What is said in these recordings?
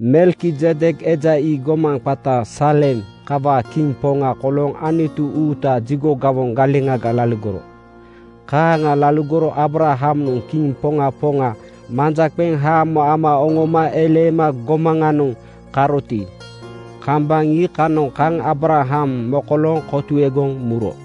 Melkizedek eja ii gomaŋ qata Saalem kawaa kiŋ poŋa kolooŋ Anutu uutaa jigo gawoŋ galeŋaga laligoro. Kaaŋa laligoro Aabrahamnoŋ kiŋ poŋa poŋa manja qeŋ haamo ama oŋoma eleema gomaŋanoŋ karoti, kambaŋ iikanoŋ kaŋ Aabraham mokolooŋ kotuegoŋ muro.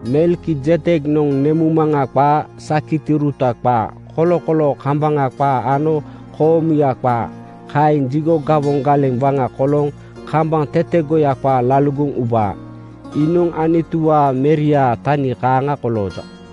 Melkizedeknoŋ nemuŋmaŋa qaa, sakitiuruta qaa, kolokoloo kambaŋa qaa ano koomuya qaa. Kaeŋ jigo gawoŋ galeŋ waŋa kolooŋ kambaŋ tetegoya qaa laligoŋ ubaa. Iinoŋ Anutuwaa Meriaa tani kaaŋa kolooja.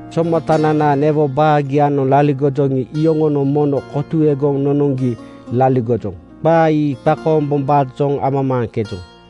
Somatananaa newo baagianoŋ laligojoŋi, iyoŋonoŋ mono kotuegoŋ nonoŋgi laligojoŋ. Qaa ii qakoombombaajoŋ amamaaŋkejoŋ.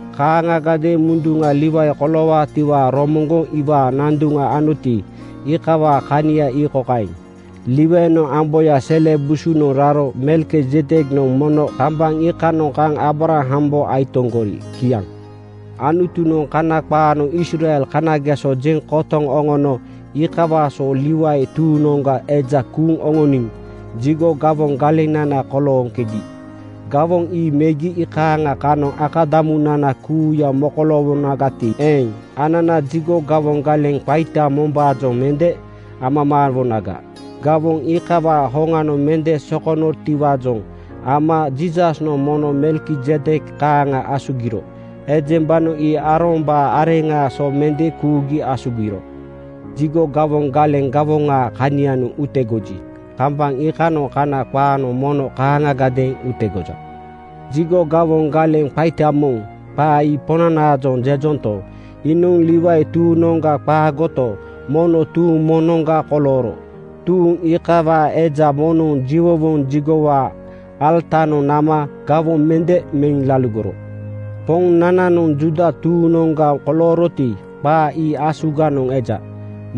Kaaŋagadeeŋ munduŋa Liwai koloowaatiwaa romoŋgoŋ iwaa nanduŋ anoti, iikawaa kania ii kokaeŋ: Liwainoŋ amboyaa sele busunoŋ raro Melkizedeknoŋ mono kambaŋ iikanoŋ kaŋ Aabrahambo aitoŋgori. Kiaŋ. Anutunoŋ Kana qaanoŋ Israel kanageso jeŋ kotoŋ nonono iikawaa so Liwai tuuŋnoŋga eja kuuŋ oŋoniŋ jigo gawoŋ galenana kolooŋkegi. Gawoŋ ii megi iikaaŋa kanoŋ akadamunana kuuya mokoloowonagati eeŋ, anana jigo gawoŋ galeŋ qaita mombaajoŋ mende amamaawonaga. Gawoŋ iikawaa hoŋanoŋ mende sokonotiwaajoŋ ama Jiisasnoŋ mono Melkizedek kaaŋa asugiro. Ejembanoŋ ii Aarombaa areŋaa so mende kuugi asugiro. Jigo gawoŋ galeŋ gawoŋaa kanianoŋ utegoji, kambaŋ iikanoŋ Kana qaanoŋ mono kaaŋiadeeŋ utegoja. ‘Jigo gawoŋ galeŋ qaita moŋ,’ qaa ii Poŋnanaajoŋ jejonto, iinoŋ Liwai tuuŋnoŋga qaagoto, mono tuuŋ moŋnoŋga kolooro. Tuuŋ iikawaa eja moŋnoŋ jiwowoŋ jigowaa alatanoŋ nama gawoŋ mende meŋ laligoro. Poŋnananoŋ Juuda tuuŋnoŋga kolooroti, qaa ii asuganoŋ eja.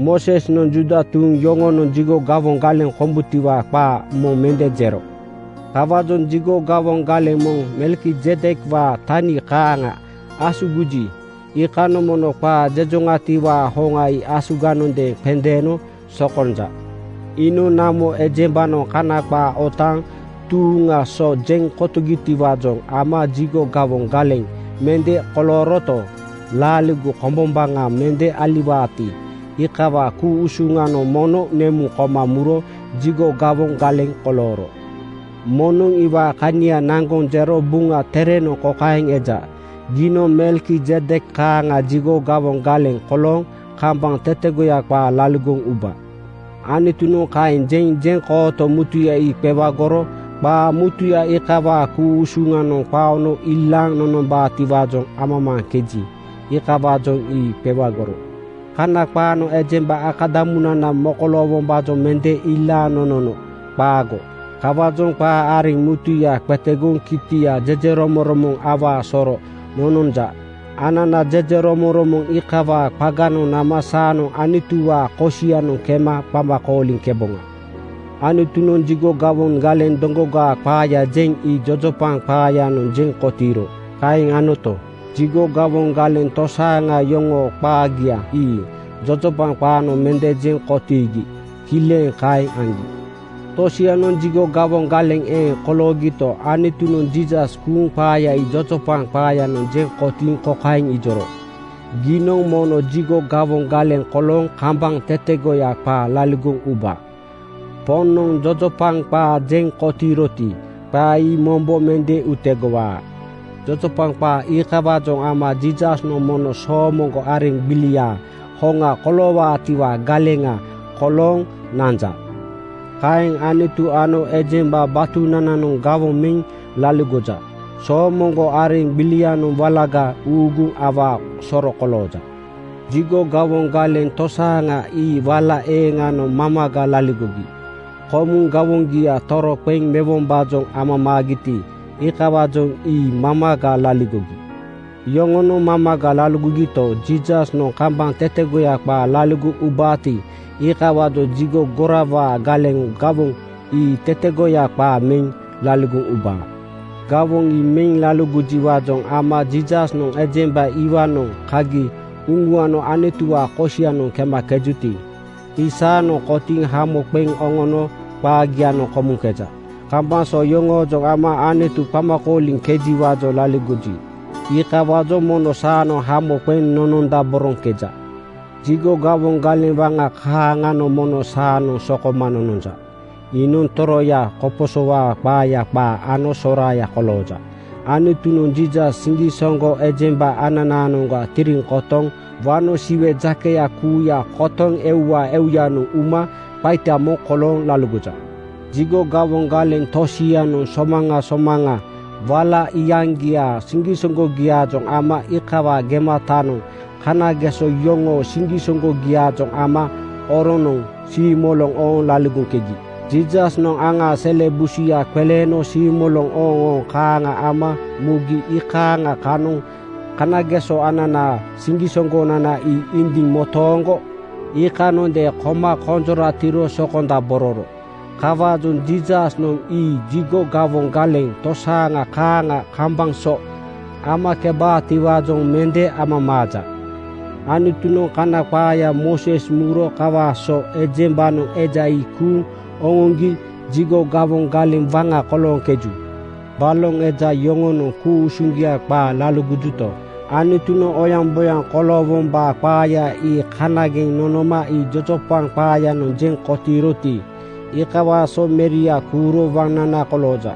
Moosesnoŋ Juuda tuuŋ yoŋonoŋ jigo gawoŋ galeŋ kombutiwaa qaa moŋ mende jero. Kawaajoŋ jigo gawoŋ galeŋ moŋ Melkizedekwaa tani kaaŋa asugiji, iikanoŋ mono qaa jejoŋatiwaa hoŋa ii asuganondeeŋ qendeeno sokonja. Iinoŋ namo ejembanoŋ Kana qaa otaaŋ tuuŋaa so jeŋ kotogitiwaajoŋ ama jigo gawoŋ galeŋ mende kolooroto, laaligo kombombaŋa mende aliwaati, iikawaa ku-usuŋanoŋ mono nemuŋ koma muro jigo gawoŋ galeŋ kolooro. Moŋnoŋ iwaa kania naŋgoŋ jero Buŋa Terenoŋ kokaeŋ eja, “Giinoŋ Melkizedek kaaŋa jigo gawoŋ galeŋ kolooŋ kambaŋ tetegoya qaa laligoŋ uba.” Anutunoŋ kaeŋ jeŋ jeŋkooto mutuya ii qewagoro. Qaa mutuya iikawaa ku-usuŋanoŋ qaono ilaaŋ nonombaatiwaajoŋ amamaaŋkeji, iikawaajoŋ ii qewagoro. Kana qaanoŋ ejemba akadamunana mokoloowombaajoŋ mende ilaaŋ nonono. Qaago. Kawaajoŋ qaa areŋ mutuya qetegoŋ kitianoŋ jejeromoŋromoŋ awaa soro nononja. Anana jejeromoŋromoŋ iikawaa qaganoŋ nama saanoŋ Anutuwaa kosianoŋ kema qama kooliŋkeboŋa. Anutunoŋ jigo gawoŋ galeŋ doŋgogaa qaaya jeŋ ii jojopaŋ qaayanoŋ jeŋ kotiiro. Kaeŋ anoto, jigo gawoŋ galeŋ tosaaŋa yoŋoo qaagia ii jojopaŋ qaanoŋ mende jeŋ kotiigi kileŋ kaeŋ aŋgi. Tosianoŋ jigo gawoŋ galeŋ eeŋ koloogito, Anutunoŋ Jiisas kuuŋ qaaya ii jojopaŋ qaayanoŋ jeŋ kotiiŋ kokaeŋ ijoro, “‘Giinoŋ mono jigo gawoŋ galeŋ kolooŋ kambaŋ tetegoya qaa laligoŋ uba.’ Poŋnoŋ jojopaŋ qaa jeŋ kotiiroti, qaa ii mombo mende utegowaa.” Jojopaŋ qaa iikawaajoŋ ama Jiisasnoŋ mono soomoŋgo areŋ gbiliaa hoŋa koloowaatiwaa galeŋa kolooŋ nanja. Kaeŋ Anutu ano ejemba batunananoŋ gawoŋ meŋ laligoja. Soomoŋgo areŋ iikanoŋ walaga uuguŋ awaa soro kolooja. Jigo gawoŋ galeŋ tosaaŋa ii wala eeŋanoŋ mamaga laligogi. Komuŋ gawoŋgia toroqeŋ mewombaajoŋ amamaagiti, iikawaajoŋ ii mamaga laligogi. Yoŋonoŋ mamaga laligogito, Jiisasnoŋ kambaŋ tetegoya qaa laligoŋ ubaati, iikawaajoŋ jigo gorawaa galeŋ gawoŋ ii tetegoya qaa meŋ laligoŋ ubaa. Gawoŋ ii meŋ laligojiwaajoŋ ama Jiisasnoŋ ejemba iwaanoŋ kagi uŋuano Anutuwaa kosianoŋ kemakejuti, ii saanoŋ kotiiŋ hamo qeŋ oŋono qaagianoŋ komuŋkeja. Kambaŋ so yoŋoojoŋ ama Anutu qama kooliŋkejiwaajoŋ laligoji, iikawaajoŋ mono saanoŋ hamo qeŋ nonondaboroŋkeja. Jigo gawoŋ galeŋ waŋa kaaŋanoŋ mono saanoŋ sokoma nononja. Iinoŋ toroya koposowaa qaaya qaa ano soraaya kolooja. Anutunoŋ Jiisas siŋgisoŋgo ejemba ananaanoŋga tiriŋ kotoŋ wano Siwe jakeya kuuya kotoŋ euwaa euyanoŋ uma qaita moŋ kolooŋ laligoja. Jigo gawoŋ galeŋ tosianoŋ somaŋa somaŋa wala iyaŋgiaa siŋgisoŋgogiaajoŋ ama iikawaa gematanoŋ kanageso yoŋoo siŋgisoŋgogiaajoŋ ama oronoŋ siimoloŋ ooŋ laligoŋkegi. Jiisasnoŋ aŋaa sele busuya qeleeno siimoloŋ ooŋooŋ kaaŋa ama mugi iikaaŋa kanoŋ kanageso ananaa siŋgisoŋgonana ii indiŋ motooŋgo iikanondeeŋ koma konjoratiro sokondabororo. Kawaajoŋ Jiisasnoŋ ii jigo gawoŋ galeŋ tosaaŋa kaaŋa kambaŋ so amakebaatiwaajoŋ mende amamaaja. Anutunoŋ Kana qaaya Mooses muro kawaa so ejembanoŋ eja ii kuuŋ oŋoŋgi jigo gawoŋ galeŋ waŋa kolooŋkeju. Baloŋ eja yoŋonoŋ ku-usuŋgia qaa laligojuto, Anutunoŋ oyaŋboyaŋ koloowombaa qaaya ii kanageŋ nonoma ii jojopaŋ qaayanoŋ jeŋ kotiiroti, iikawaa so Meria kuuro waŋnana kolooja.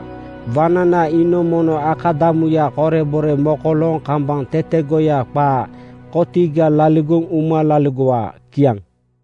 Waŋnana iinoŋ mono akadamuya korebore mokolooŋ kambaŋ tetegoya qaa kotiga laligoŋ uma laligowaa. Kiaŋ.